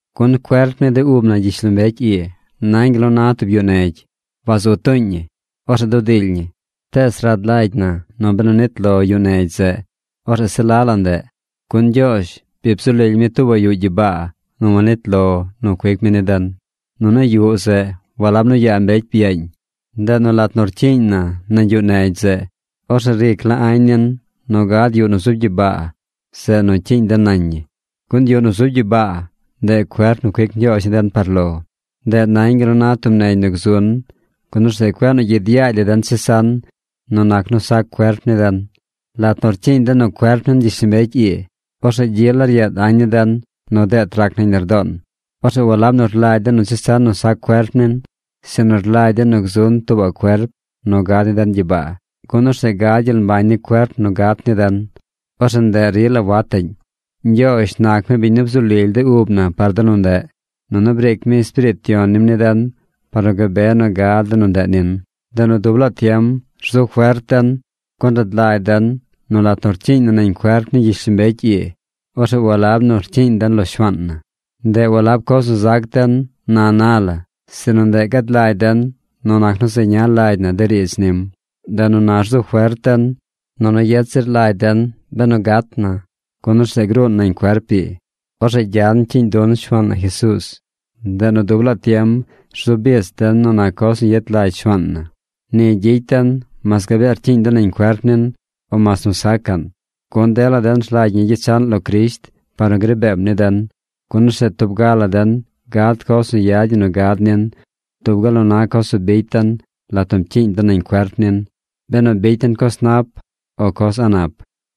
Gun cuerp ni de ub na gyishlombecy ii nañ gal nu na tub yuꞌ negy. Wazu tuuñ ñi. Orzeꞌ dudily ñi. Tees rad lagy na nu benu nit lo yuꞌ negy zeꞌ, orzeꞌ se la la ndeꞌ, gun Ñgyoozh bi bzu lily mi tuubaꞌ yuꞌ gyibaa nu wanit lo nu cuic mi ni den. Nunu yuꞌ zeꞌ walab nu yaa mbecy byaañ. Ndeꞌ nu lat nu rcyiiñ na nañ yuꞌ negy zeꞌ, orzeꞌ ric la añ nin nu gad yuꞌ nu zub gyibaa, zeꞌ nu cyiiñ den nañ ñi. Gun yuꞌ nu zub gyibaa, ndeꞌ cuerp nu cuic Ñgyoozh ni den par lo. Ndeꞌ nañ gal nu na tub negy nu gzun, gun orzeꞌ cueꞌ nu gyid yaagy la den chesan nu nac nu sac cuerp ni den. Lat nu rcyiiñ den nu cuerp nin gyishlombecy ii, orzeꞌ gyi la ryeed añ ni den nu deet rac nañ lardoon. Orzeꞌ walab nu rlagy den nu chesan nu sac cuerp nin, sinu rlagy den nu gzun tuubaꞌ cuerp nu gad ni den gyibaa, gun orzeꞌ gad gyel mbañ ni cuerp nu gat ni den. Orzeꞌ ndeꞌ rila wataꞌñ. Ñgyoozh nac mi biñ nu bzu lily de ub na par de nu ndeꞌ. Nunu briic mi Espiriit Yon nim ni den par nu gabe nu gad de nu ndeꞌ nin. Ndeꞌ nu dub laa tiem rzu fert den. Gun rad lagy den nu lat nu rcyiiñ na nañ cuerp ni gyishlombecy ii, orzeꞌ walab nu rcyiiñ den lo Shuaan na. Ndeꞌ walab coz nu zac den na na la, sinu ndeꞌ gad lagy den nu nac nu zeña lagy na de riidz nim. Ndeꞌ nu na rzu fert den, nunu yet zir lagy den benu gat na, gun orzeꞌ gruun nañ cuerp ii. Orzeꞌ gyan cyiiñ dun Shuaan na Jesuuz. Ndeꞌ nu dub laa tiem rzu bich den nu nac coz nu yet lagy Shuaan na. Ni gyicy den mas gabee rcyiiñ den nañ cuerp nin, o mas nu sacaꞌn. Gun dela den rlagy ñi gyechaꞌn lo Crisht par nu gri beem ni den, gun orzeꞌ tub ga la den gad coz nu yad ñi nu gad nin dub gal nu na coz nu bicy den lat nu pcyiiñ den nañ cuerp nin: benu bicy den coz nap o coz a̱ꞌ nap.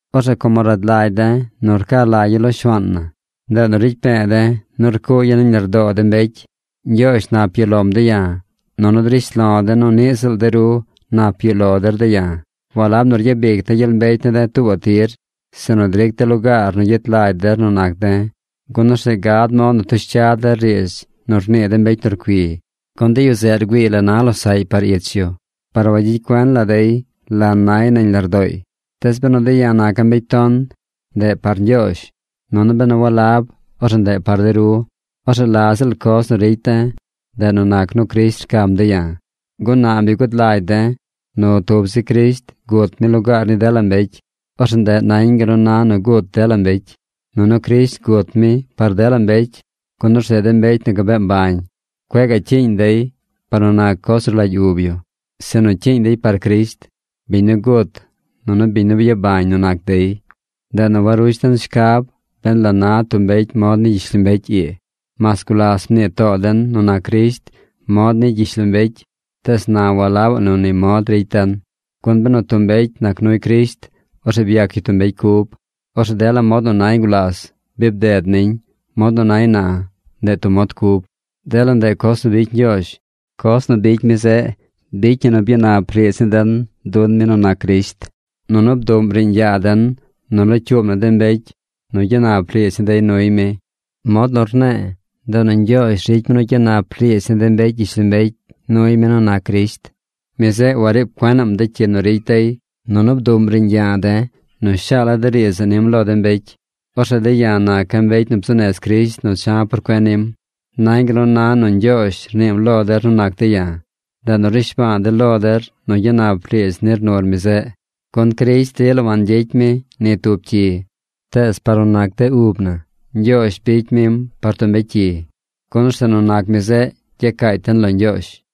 Orzeꞌ como rad lagy de̱ nu rca lagya̱ lo Shuaan na, ndeꞌ nu ricy pe̱e̱ de̱ nu rcuugya̱ nañ lardoo de mbecy. Ñgyoozh nap yuꞌ lom de̱ ya̱, nunu drish lo̱ de̱ nu niꞌ ziꞌl de ru nap yuꞌ lo der de̱ ya̱. Walab nu ryabic de̱ gyel mbecy ne̱ de̱ tuubaꞌ tir, sinu dric de̱ lugaar nu gyet lagy der nu nac de̱, gun orzeꞌ gad mod nu tush cya der riidz nu rnii de mbecy nu rcui. Gun de yu zeꞌ rgüiiy la na losaꞌy par ich yu, par wagyicy cuen la dey la nay nañ lardooy. Tees benu de̱ ya̱ naca̱ mbecy ton, ndeꞌ par Ñgyoozh. Nunu benu walab, orzeꞌ ndeꞌ par de ru. Orzeꞌ la ziꞌl coz nu ricy de̱, ndeꞌ nu nac nu Crisht rcam de̱ ya̱. Gun na bi gud lagy de̱ nu tub zi Crisht gut mi lugaar ni dela mbecy. Orzeꞌ ndeꞌ nañ gal nu na nu gut dela mbecy. Nunu Crisht gut mi par dela mbecy, gun orzeꞌ de mbecy nu gabee mbañ, cueꞌ gaꞌ cyiiñ dey par nu nac coz nu rlagy ub yu, sinu cyiiñ dey par Crisht, biñ nu gut nunu biñ nu byabañ nu nac dey. Ndeꞌ nu warush den shcab ben la na tub mbecy mod ni gyishlombecy ii. Mas gulas mnii too den nu nac Crisht mod ni gyishlombecy, tees na walabaꞌ nu ni mod ricy den. Gun benu tub mbecy nac nuy Crisht, orzeꞌ byac yu tub mbecy cub. Orzeꞌ dela mod nu nay gulas, bi bded niñ. Mod nu nay na, ndeꞌ tub mod cub. Dela ndeꞌ coz nu bicy Ñgyoozh. Coz nu bicy mi zeꞌ bicy ñi nu byanap riidz ni den dun mi nu nac Crisht. Nunu bduꞌm riiñ yaa den nu locyuub na de mbecy nu gyanap riidz ni dey nuy mi. Mod nu rne̱e̱, ndeꞌ nu Ñgyoozh ricy mi nu gyanap riidz ni de mbecy gyishlombecy nuy mi nu nac Crisht. Mi zeꞌ wariib cuenaꞌm de cyi nu ricy dey. Nunu bduꞌm riiñ yaa den nu shaala̱ de riidz zeꞌ nim lo de mbecy. Orzeꞌ de̱ ya̱ naca̱ mbecy nu bzuu nez Crisht nu cha̱ por cuen nim. Nañ gal nu na nu Ñgyoozh rniim lo der nu nac de̱ ya̱. Ndeꞌ nu rnishba̱a̱ de̱ lo der nu gyanap riidz nir nur mi zeꞌ. Gun Crisht rila wangyicy mi ni tub cyi. Tees par nu nac de ub na, Ñgyoozh bicy mim par tub mbecy cyi. Gun orzeꞌ nu nac mi zeꞌ, gyacaacy den lo Ñgyoozh.